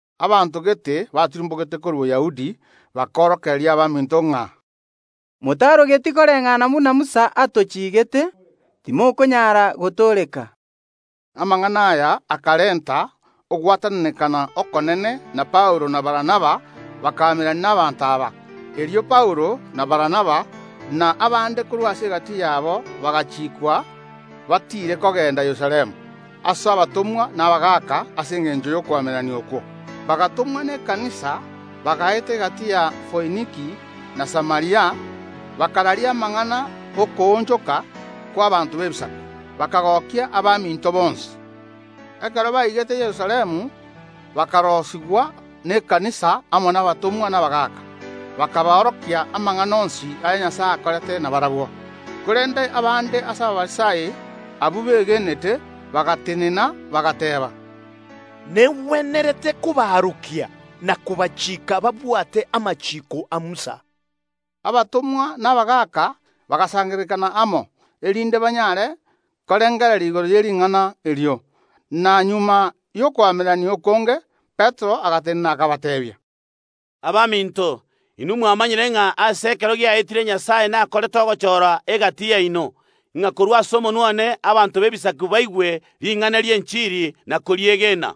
Abanto gete batirimbogete korwa Boyahudi bakorokereria abaminto ng’a: “Motarogeti koreng’ana buna Musa atochigeete, timokonyaara gotooreka.” Amang’ana aya akarenta ogwatananekana okonene, na Paulo na Barnaba bakaamererania n’abanto aba. Erio Paulo, na Barnaba, na abande korwa ase egati yabo bagachiikwa batiire gochia Yerusalemu ase abatomwa na abagaaka ase engencho y’okoamererania okwo. Bagatomwa ekanisa, bagaeta gati ya Foiniki na Samaria, bakararia amang’ana ’okoonchoka kw’abaanto b’Ebisaku, bakagokia abaminto bonsi. Ekero baigete Yerusalemu bakaroisigwa n’ekanisa amo n’Abatomwa na abagaaka, bakaboorokia amang’ana onsi aya Nyasae akorete nabarabwo. Korende abande ase Abafarisai, abwo begenete, bagatenena, bagateeba: “Negwenerete kobaorokia na kobachiika babwate amachiiko a Musa.” Abatomwa na abagaaka bagasangererekana amo, erinde banyare korengereria igoro ye ring’ana erio. Na magega y’okoamererania okonge Petero agatenena akabateebia: “Abaminto, inwe mwamanyire ng’a ase ekero giaetire Nyasae nakorete ogochora egati yaino, ng’a korwa ase omonwa one abanto b’Ebisaku baigwe ring’ana ri’enchiri na koriegena.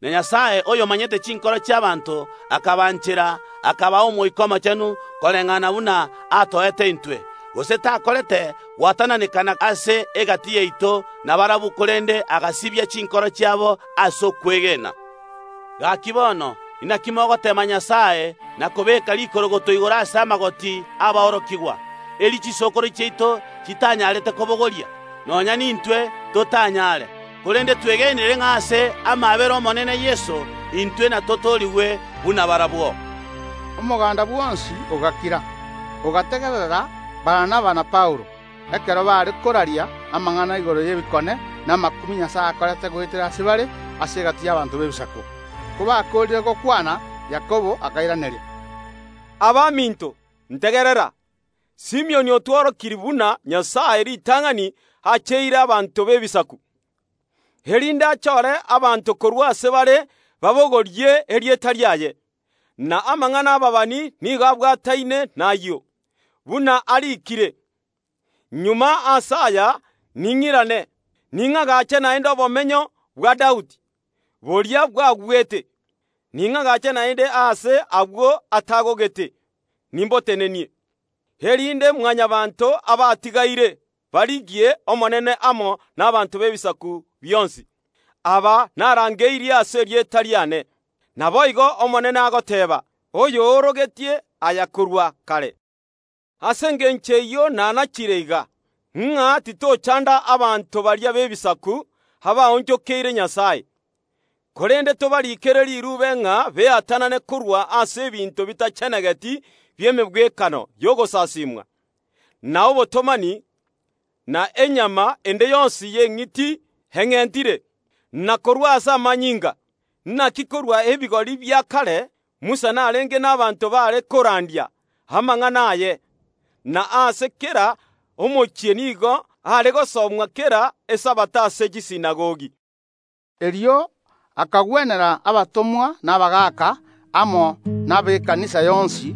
Na Nyasae, oyomanyete chinkoro chi’abaanto, akabanchera, akabaa Omoika Omochenu, koreng’ana buna atoete intwe, gose takorete gwatananekana ase egati yaito na barabwo, korende agasibia chinkoro chiabo ase okwegena. Gaki, bono inaki mogoteema Nyasae na kobeeka rikorogoto igoro ase amagoti ’aborokigwa, eri chisokoro chiaito chitanyarete kobogoria, nonya nintwe totanyaare. Korende twegenire ng’a ase amaabera a Yeso, Omonene intwe natotoorigwe buna barabwo.” Omoganda bwonsi ogakira, ogategerera Barnaba na Paulo, ekero baare koraria amang’ana igoro y’ebikone na amakumia Nyasae akorete goetera ase bare ase egati y’abanto b’Ebisaku. Kobakoorire gokwana, Yakobo akairaneria: Abaminto, ntegerera. Simioni otworokirie buna Nyasae ritang’ani acheire abanto b’Ebisaku, erinde achore abanto korwa ase bare babogorie erieta riaye. Na amang’ana ’ababani nigo abwataine nayio, buna ariikire, Magega ase aya ning’irane, ning’agache naende obomenyo bwa Daudi, boria bwagwete. Ning’agache naende aase agwo atagogete, nimbotenenie, erinde Mwanyabaanto abatigaire barigie Omonene amo n’abanto b’Ebisaku bionsi, aba narangeirie ase erieta riane. Naboigo Omonene agoteeba, oyo oorogetie aya korwa kare. Ase engencho eyio nanachire iga, ng’a titochanda abanto baria b’Ebisaku abaonchokeire Nyasae, korende tobarikere riruube ng’a beatanane korwa ase ebinto bitachenegeti bi’emegwekano y’ogosaasimwa, na obotomani, na enyama ende yonsi y’eng’iti eng’entire, na korwa ase amanyinga. Naki korwa ebigori bia kare Musa narenge n’abanto baare korandia amang’ana aye, na ase kera omochie nigo are gosomwa kera Esabato ase chisinagogi. Erio akagwenera abatomwa na abagaaka amo na ekanisa yonsi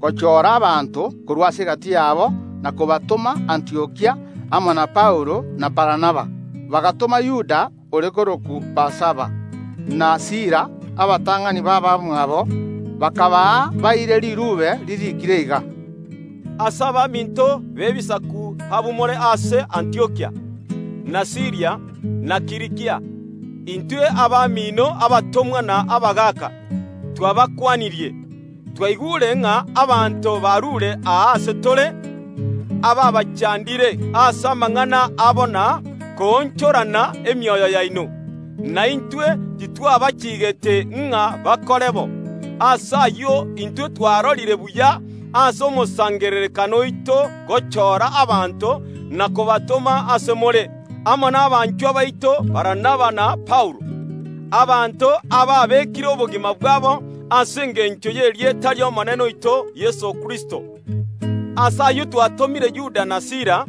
gochora abanto korwa ase egati yabo na kobatoma Antiokia amo na Paulo na Barnaba. Bagatoma Yuda ore korokwa Barsaba, na Sila, abatang’ani b’abamwabo, bakabaa baire riruube ririikire iga: “Ase abaminto b’Ebisaku abamore ase Antiokia, na Siiria, na Kilikia. Intwe abamino, abatomwa na abagaaka, twabakwanirie. Twaigure ng’a abanto baruure aa ase tore abaabachandire ase amang’ana abo na koonchorana emioyo yaino, na intwe titwabachiigete ng’a bakore bo. Ase ayio, intwe twarorire buya ase omosangererekano oito gochora abanto na kobatoma ase more amo nabanchwa baito Barnaba na Paulo, abanto ababekire obogima bwabo ase engencho y’erieta ri’Omonene oito Yeso Kristo. Ase ayio twatomire Yuda na Sila,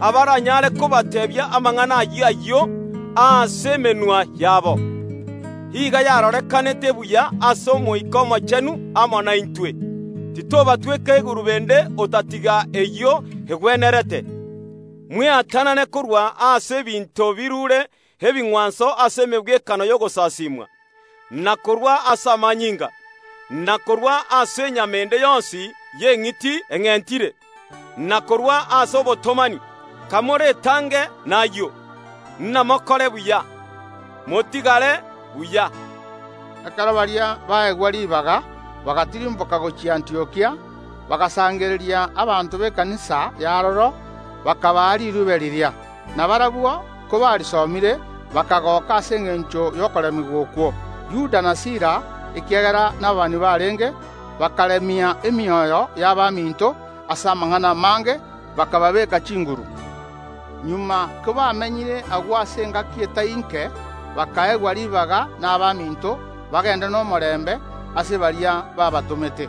abaranyare kobateebia amang’ana ayio ayio ase emenwa yabo. Iga yarorekanete buya ase Omoika Omochenu amo naintwe, titobatweka egurube ende otatiga eyio egwenerete: Mweatanane korwa ase ebinto biruure ebing’wanso ase emegwekano y’ogosasiimwa, na korwa ase amanyinga, na korwa ase enyama ende yonsi y’eng’iti eng’entire, na korwa ase obotomani. Kamoretange nayio, namokore buya. Motigare buya.” Ekero baria baegwa ribaga, bagatirimboka gochia Antiokia, bagasangereria abanto b’ekanisa y’aroro, bakabaa riruube riria. Na barabwo kobarisomire, bakagoka ase engencho y’okoremigwa okwo. Yuda na Sila, ekiagera nababani barenge, bakaremia emioyo y’abaminto ase amang’ana amange, bakababeeka chinguru. Magega kobamenyire agwo ase engaki etai ’nke, bakaegwa ribaga nabaminto bagende nomorembe ase baria baabatomete. [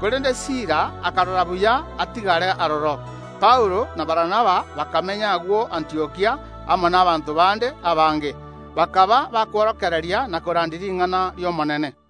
Korende Sila akarora buya atigare aroro.] Paulo na Barnaba bakamenya agwo Antiokia amo n’abanto bande abange, bakaba bakworokereria na korandia ring’ana ri’Omonene.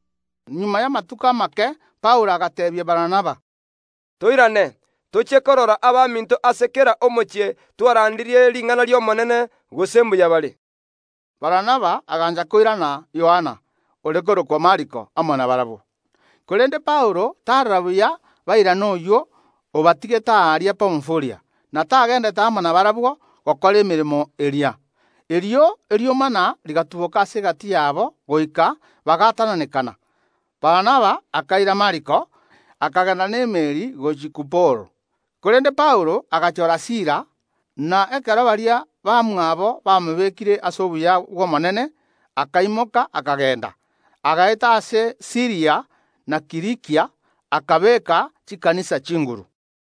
Magega y’amatuko amake Paulo agateebia Barnaba: “Toirane, tochie korora abaminto ase kera omochie twarandirie ring’ana ri’Omonene, gose mbuya bare.” Barnaba agancha koirana Yohana, ore korokwa Mariko, amo nabarabwo. Korende Paulo tarora buya bairane oyio obatigete aaria Pamfulia, na tagendete amo nabarabwo gokora emeremo eria. Erio eriomana rigatuboka ase egati yabo goika bagaatananekana. Barnaba akaira Mariko, akagenda n’emeeri gochia Kuporo, korende Paulo agachora Sila, na ekero abegeni bamobekeire amaboko, akaimoka akagenda. Agaeta ase Siiria na Kilikia, akabeeka Ekanisa chinguru.